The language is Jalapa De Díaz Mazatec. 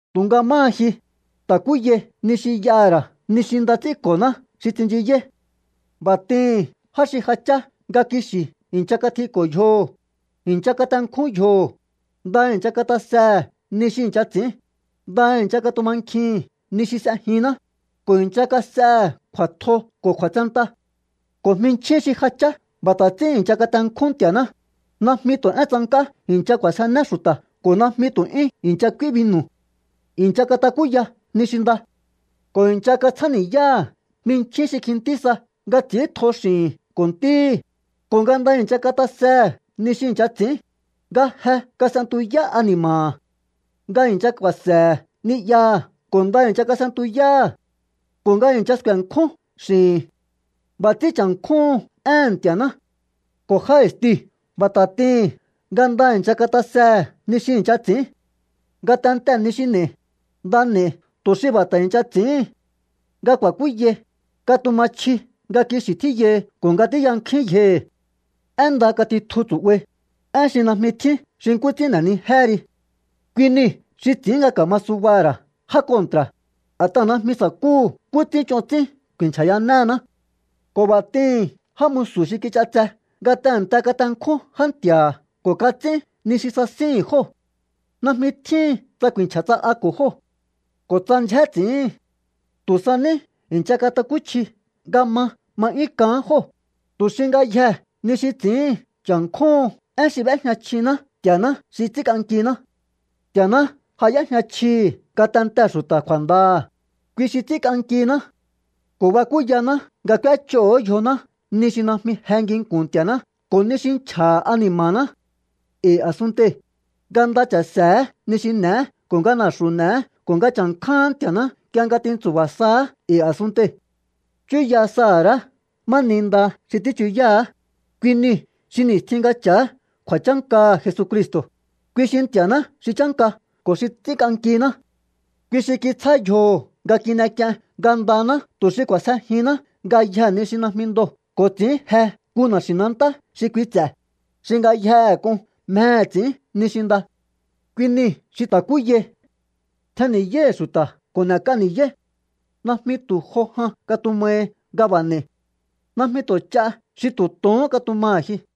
Tu̱nga máha ji, ta̱kúyai ni xi y'aha̱ ra̱ ni xi nda ts'ínko̱ná xi tsinchiyáí. B'a̱ t'ihi̱n já xi ja chá nga kixi̱ i̱ncha katjiko̱ yjoho̱, i̱ncha katenkjún yjoho̱, nda i̱ncha katasehe̱ ni xi i̱ncha ts'i̱ín, nda i̱ncha katumankjihi̱n ni xi s'ejinná, ko̱ i̱ncha kas'ehe̱ kju̱a̱tjo ko̱ kju̱a̱tsenta. Ko̱ jminchjín xi ja chá b'a̱ ta̱ ts'ín i̱ncha katenkjún Nti̱a̱ná, najmi tu̱ én tsank'á i̱ncha k'u̱a̱sjené xu̱ta̱ ko̱ najmi tu̱ 'yún i̱ncha k'úí binu̱. I̱ncha katakúya ni xi nda ko̱ i̱ncha katsjáni̱yáha̱ jminchjín xi kjintí sa nga ts'i̱íntjo x'i̱hi̱n ko̱ ntíhi̱, ko̱ nga nda i̱ncha katasehe̱ ni xi i̱ncha ts'i̱ín, nga je kas'entuyá ani̱ma̱ha̱, nga i̱ncha ku̱a̱se̱he̱ ni'yaha̱ ko̱ nda i̱ncha s'e̱ntuyáha̱, ko̱ nga i̱ncha sku̱e̱nkjún x'i̱hi̱n. B'a̱ ts'ín cha̱nkjúhun éhe̱n Nti̱a̱ná. Ko̱ já i̱stiu̱ b'a̱ ta̱ t'ihi̱n nga nda i̱ncha katasehe̱ ni xi i̱ncha ts'i̱ín. Ngatentee̱ ni xi n'e̱i, nda n'e̱i tu̱ xi b'a̱ ta̱ i̱ncha ts'i̱íhin. Nga ku̱a̱kúyai, katuma chji nga kixi̱ tjíyahi ko̱ nga tíyankjúín yjohi̱. Én nda katitju tsu̱'bai, én xi najmi tjín xi nkú ts'ín n'e̱nijéhe ri. Kui niu̱ xi ts'i̱ín nga ka̱ma subaha̱ ra̱ já kontra̱, a̱t'aha̱ najmi sa̱kúhu̱ nkú ts'ín ch'on ts'ín ku̱i̱nchja̱yanehená. Ko̱ b'a̱ t'ihi̱n já musu̱ xi kich'atse nga tehe̱nte katenkjún já nti̱a̱ha̱ ko̱ kats'ín ni xi sasíhi̱n jóo̱. Najmi tjíhin tsa ku̱i̱nchja̱ tsa'ako̱ jóo̱ ko̱ tsa ndyjé ts'i̱íhi̱n. Tu̱ sa ní i̱ncha katakúchji nga ma ma 'yún k'aán jóo̱, tu xi ngayjee̱ ni xi ts'i̱íhin cha̱nkjúhun én xi b'éjña chjiná Nti̱a̱ná xi ts'ínk'ankiná. Nti̱a̱ná ja y'éjña chjihi̱ ngatentehe̱ xu̱ta̱ kju̱a̱ndaha̱, kui xi ts'ínk'ankiná ko̱ bakúyaná nga k'úéch'oo̱hó yjoná ni xi najmi je nginku̱n Nti̱a̱ná ko̱ ni xi nchja̱ha̱ ani̱ma̱ná e̱i̱ a̱sunntei̱, nga nda cha̱se̱hé ni xi n'e̱é ko̱ nga na̱xu̱ n'eé ko̱ nga cha̱nkjáán Nti̱a̱ná nk'ie nga tintsu̱ba̱ saá e̱i̱ a̱sunntei̱. Chúya saha̱ ra̱á ma ni nda xi tíchuyáá, kui niu̱ xi ni̱stjin nga cha̱á kju̱a̱chánkaha̱ Jesucristo̱, kui xi Nti̱a̱ná xi chánka ko̱ xi ts'ínk'ankiná. Kui xi kitsjá yjoho̱ nga kin'ek'ien ngandaná tu̱ xi k'u̱a̱sjejihinná ngayjee̱ ni xi najmi ndoo̱ ko̱ ts'i̱ín je nku na̱xi̱nantá xi kui ts'e̱, xi ngayjehe k'un mjehe̱ ts'i̱ín ni xi nda. Kui nii̱ xi ta̱kúyai. Tjenni̱yáíhi̱ xu̱ta̱ ko̱ n'e̱k'a ni̱yáí. Najmi tu̱ jo jan katumahi nga b'a̱ n'e̱i. Najmi tu̱ ch'a xi tu̱ tohón katumaha̱ ji.